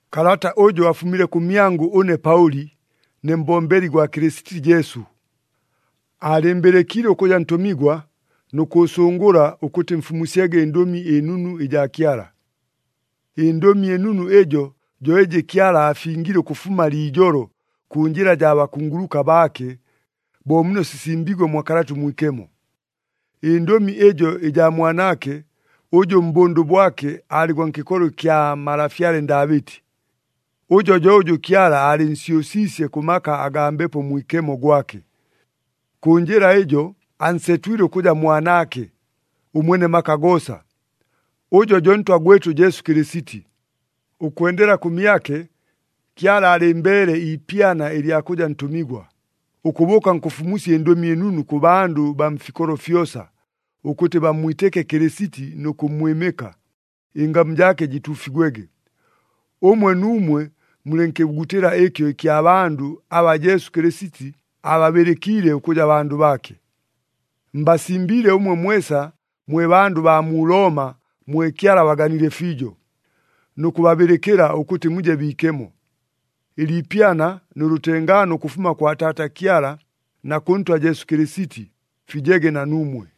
Kalata ʉjʉ afumile kʉmyangʉ ʉne Paʉli, ne mbombeli gwa Kɨlɨsiti Jesu. Aalɨɨmbɨlɨkiile ʉkʉja ntʉmigwa nʉ kʉʉsʉngʉla ʉkʉtɨ mfumusyege ɨNdʉmi ɨNunu ɨjaa Kyala. ƗNdʉmi ɨNunu ɨjo, jo ɨjɨ Kyala aafingile ʉkʉfuma liijolo, kʉ njɨla jaa bakunguluka baake, bo muno sisimbiigwe mwa Kalata ʉMwikemo. Ɨndʉmi ɨjo ɨjaa Mwanaake, ʉjʉ mbʉndʉ bwake aalɨ gwa nkɨkolo ɨkya malafyale Ndaabɨti. Ʉjo jo ʉjʉ Kyala aalɨnsyʉsiisye kʉ maka agaa Mbepo Mwikemo gwake. Kʉ njɨla ɨjo, ansetwile ʉkʉja Mwanaake, ʉMwene maka goosa. Ʉjo jo Ntwa gwɨtʉ Jesu Kɨlɨsiti. Ʉkwendela kʉmyake, Kyala aalɨmbeele iipyana ɨlya kʉja ntʉmigwa, ʉkʉbʉʉka nkʉfumusya ɨNdʉmi ɨNunu kʉ bandʉ baa mfikolo fyosa, ʉkʉtɨ bammwitɨke Kɨlɨsiti nʉ kʉmmwɨmɨka, ɨngamu jaake jɨtuufigwege. Ʉmwe nuumwe mulɨ nkɨbugutɨla ɨkyo ɨkya bandʉ aba Jesu Kɨlɨsiti ababɨlɨkiile ʉkʉja bandʉ baake. Mbasimbiile ʉmwe mwesa mwe bandʉ baa mu Looma mwe Kyala abaganile fiijo, nʉ kʉbabɨlɨkɨla ʉkʉtɨ muje biikemo. Ɨliipyana nʉ lʉtengaano ʉkʉfuma kwa Taata Kyala na kʉ Ntwa Jesu Kɨlɨsiti, fijege na nuumwe.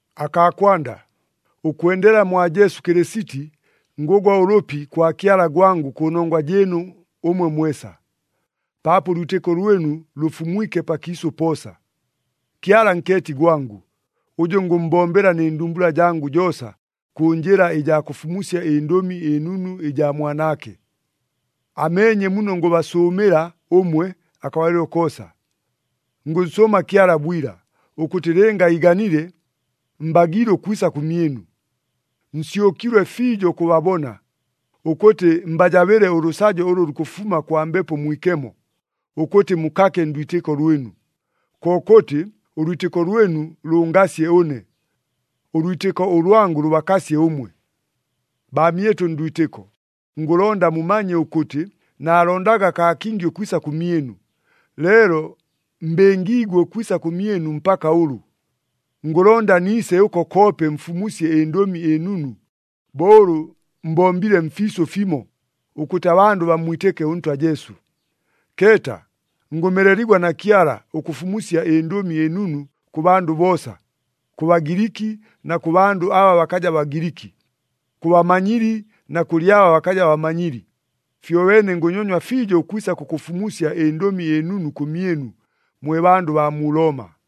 Akaa kwanda, ʉkwendela mwa Jesu Kɨlɨsiti, ngʉgwa ʉlʉpi kwa Kyala gwangʉ kʉnongwa jɨɨnu ʉmwe mwesa, paapo ʉlwitɨko lwɨnu lʉfumwike pakiisʉ poosa. Kyala nkeeti gwangʉ, ʉjʉ ngʉmmbombela nɨ ndumbula jangʉ joosa, kʉ njɨla ɨjaa kʉfumusya ɨNdʉmi ɨNunu ɨjaa Mwanaake. Ameenye muno ngʉbasʉʉmɨla ʉmwe akabalɨlo koosa. Ngʉnsʉʉma Kyala bwila, ʉkʉtɨ lɨnga iiganile, mbagiile ʉkwisa kʉmyɨnu. Nsyʉkilwe fiijo ʉkʉbabona, ʉkʉtɨ mbajabɨle ʉlʉsajo ʉlʉ lukʉfuma kwa Mbepo Mwikemo, ʉkʉtɨ mukake ndwitɨko lwɨnu. Kokʉtɨ, ʉlwitɨko lwɨnu lʉngasye ʉne, ʉlwitɨko ʉlwangʉ lʉbakasye ʉmwe. Baamyɨtʉ ndwitɨko, ngʉlonda mumanye ʉkʉtɨ, naalondaga kaa kingi ʉkwisa kʉmyɨnu. Leelo mbɨngiigwe ʉkwisa kʉmyɨnu mpaka ʉlʉ. Ngʉlonda niise ʉko koope mfumusye ɨNdʉmi ɨNunu, bo ʉlʉ mbombile mfiisʉ fimo, ʉkʉtɨ abandʉ bammwitɨke ʉNtwa Jesu. Keeta, ngʉmeleligwa na Kyala, ʉkʉfumusya ɨNdʉmi ɨNunu kʉ bandʉ boosa, kʉ Bagiliki na kʉ bandʉ aba bakaja Bagiliki, kʉ bamanyili na kʉlɨ aba bakaja bamanyili. Fyobeene ngʉnyonywa fiijo ʉkwisa kʉkʉfumusya ɨNdʉmi ɨNunu kʉmyɨnu, mwe bandʉ baa mu Looma.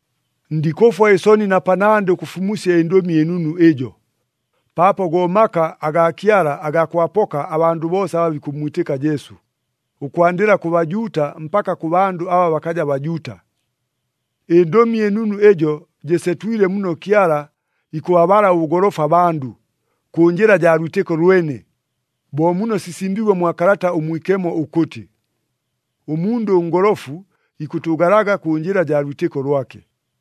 Ndikʉfwa ɨsoni na panandɨ ʉkʉfumusya ɨNdʉmi ɨNunu ɨjo, paapo go maka agaa Kyala agaa kʉbapoka abandʉ boosa aba bikʉmmwitɨka Jesu, ʉkwandɨla kʉ Bajuuta mpaka kʉ bandʉ aba bakaja Bajuuta. ƗNdʉmi ɨNunu ɨjo jɨsetwile muno Kyala ikʉbabala ʉbʉgolofu abandʉ, kʉ njɨla jaa lwitɨko lwene, bo muno sisimbiigwe mwa Kalata ʉMwikemo ʉkʉtɨ, “Ʉmundʉ ʉngolofu ikʉtʉʉgalaga kʉ njɨla jaa lwitɨko lwake.”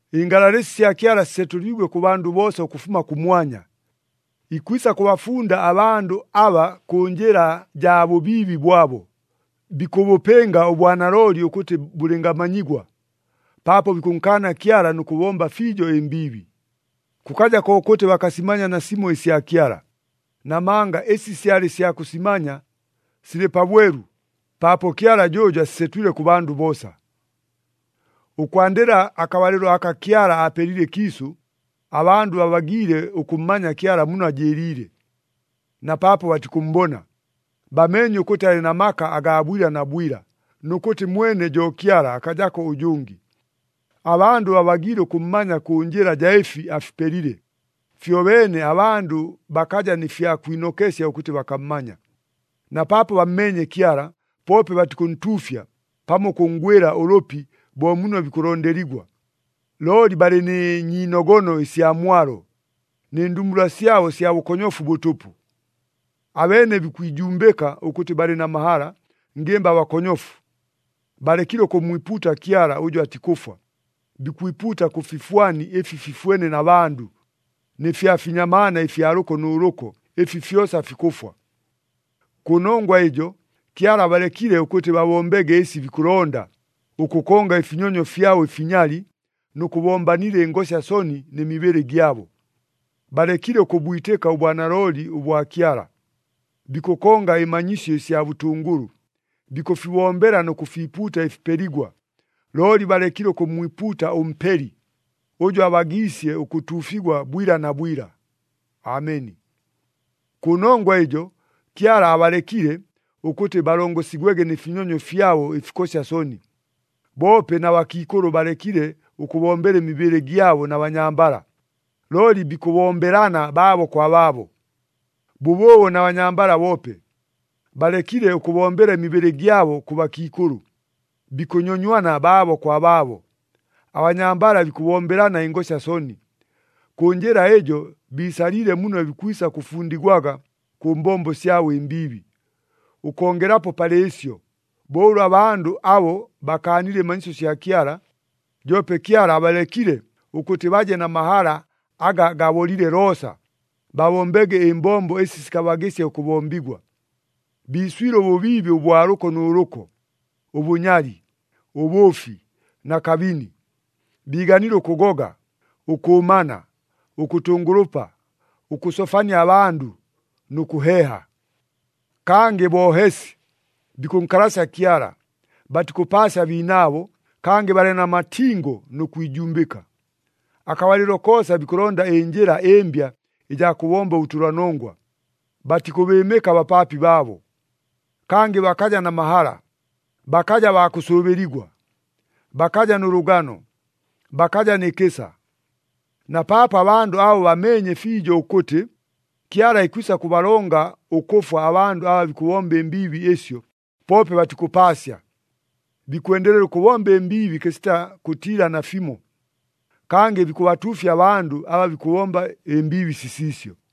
Ɨngalalɨsi sya Kyala sisetʉliigwe kʉ bandʉ boosa ʉkʉfuma kʉmwanya. Ikwisa kʉbafunda abandʉ aba kʉ njɨla jaa bʉbiibi bwabo, bikʉbʉpɨnga ʉbwanalooli ʉkʉtɨ bʉlɨngamanyigwa, paapo bikʉnkaana Kyala nʉ kʉbomba fiijo ɨmbiibi. Kʉkaja kokʉtɨ bakasimanya nasimo ɨsya Kyala, namanga ɨsi syalɨ sya kʉsimanya, silɨ pabwelu, paapo Kyala jʉʉjo asisetwile kʉ bandʉ boosa. Ʉkwandɨla akabalɨlo aka Kyala aapelile ɨkiisʉ, abandʉ babagiile ʉkʉmmanya Kyala muno ajɨɨliile. Na paapo batikʉmmbona, bameenye ʉkʉtɨ alɨ na maka agaa bwila na bwila, nʉ kʉtɨ mwene jo Kyala, akajako ʉjʉngɨ. Abandʉ babagiile ʉkʉmmanya kʉ njɨla jaa ɨfi afipelile, fyobeene abandʉ bakaja nɨ fya kwinokesya ʉkʉtɨ bakammanya. Na paapo bammeenye Kyala, poope batikʉntuufya pamo ʉkʉnngwɨla ʉlʉpi bo muno bikʉlondeligwa. Looli balɨ nɨ nyiinogono ɨsya mwalo, nɨ ndumbula syabo sya bʉkonyofu bʉtʉpʉ. Abeene bikwijumbɨka ʉkʉtɨ balɨ na mahala, ngɨmba bakonyofu. Balekile ʉkʉmmwipuuta Kyala ʉjʉ atikʉfwa, bikwipuuta kʉ fifwani ɨfi fifwene na bandʉ, nɨ fya finyamaana ɨfya lʉko nʉ lʉko, ɨfi fyosa fikʉfwa. Kʉnongwa ɨjo, Kyala abalekile ʉkʉtɨ babombege ɨsi bikʉlonda, ʉkʉkonga ɨfinyonyo fyabo ɨfinyali nʉ kʉbombanila ɨngosya soni nɨ mibɨlɨ gyabo. Balekile ʉkʉbwitɨka ʉbwanalooli ʉbwa Kyala, bikʉkonga ɨmanyisyo ɨsya bʉtʉngʉlʉ. Bikʉfibombela nʉ kʉfiipuuta ɨfipeligwa, looli balekile ʉkʉmmwipuuta ʉMpeli, ʉjʉ abagiisye ʉkʉtuufigwa bwila na bwila! Ameni. Kʉnongwa ɨjo, Kyala abalekile, ʉkʉtɨ balongosigwege nɨ finyonyo fyabo ɨfikosya soni. Boope na bakiikʉlʉ balekile ʉkʉbombela ɨmibɨlɨ gyabo na banyambala, looli bikʉbombelana baabo kwa baabo. Bʉbʉʉbo na banyambala boope, balekile ʉkʉbombela ɨmibɨlɨ gyabo kʉ bakiikʉlʉ, bikʉnyonywana baabo kwa baabo. Abanyambala bikʉbombelana ɨngosya soni. Kʉ njɨla ɨjo biisaliile muno bikwisa kʉfundigwaga kʉ mbombo syabo ɨmbiibi. Ʉkongelapo palɨ ɨsyo, bo ʉlʉ abandʉ abo bakaanile ɨmanyisyo sya Kyala, joope Kyala abalekile ʉkʉtɨ baje na mahala aga gabolile loosa, babombege ɨmbombo ɨsi sikabagɨsya ʉkʉbombigwa. Biiswile ʉbʉbiibi ʉbwa lʉko nʉ lʉko, ʉbʉnyali, ʉbʉʉfi na kabini. Biiganile ʉkʉgoga, ʉkʉʉmana, ʉkʉtʉngʉlʉpa, ʉkʉsofania abandʉ, nʉ kʉheeha. Kangɨ boohesi, bikʉnkalasya Kyala, batikʉpaasya abiinaabo, kangɨ balɨ na matingo nʉ kwijumbɨka. Akabalɨlo koosa bikʉlonda ɨnjɨla ɨmbya ɨjaa kʉbomba ʉbʉtʉlanongwa, batikʉbɨɨmɨka abapaapi baabo. Kangɨ bakaja na mahala, bakaja baa kʉsʉʉbɨligwa, bakaja nʉ lʉgano, bakaja nɨ kɨsa. Na paapo abandʉ abo bameenye fiijo ʉkʉtɨ, Kyala ikwisa kʉbalonga ʉkʉfwa abandʉ aba bikʉbomba ɨmbiibi ɨsyo, poope batikʉpaasya! Bikwendelela ʉkʉbomba ɨmbiibi kɨsita kʉtiila nafimo, kangɨ bikʉbatuufya abandʉ aba bikʉbomba ɨmbiibi sisiisyo.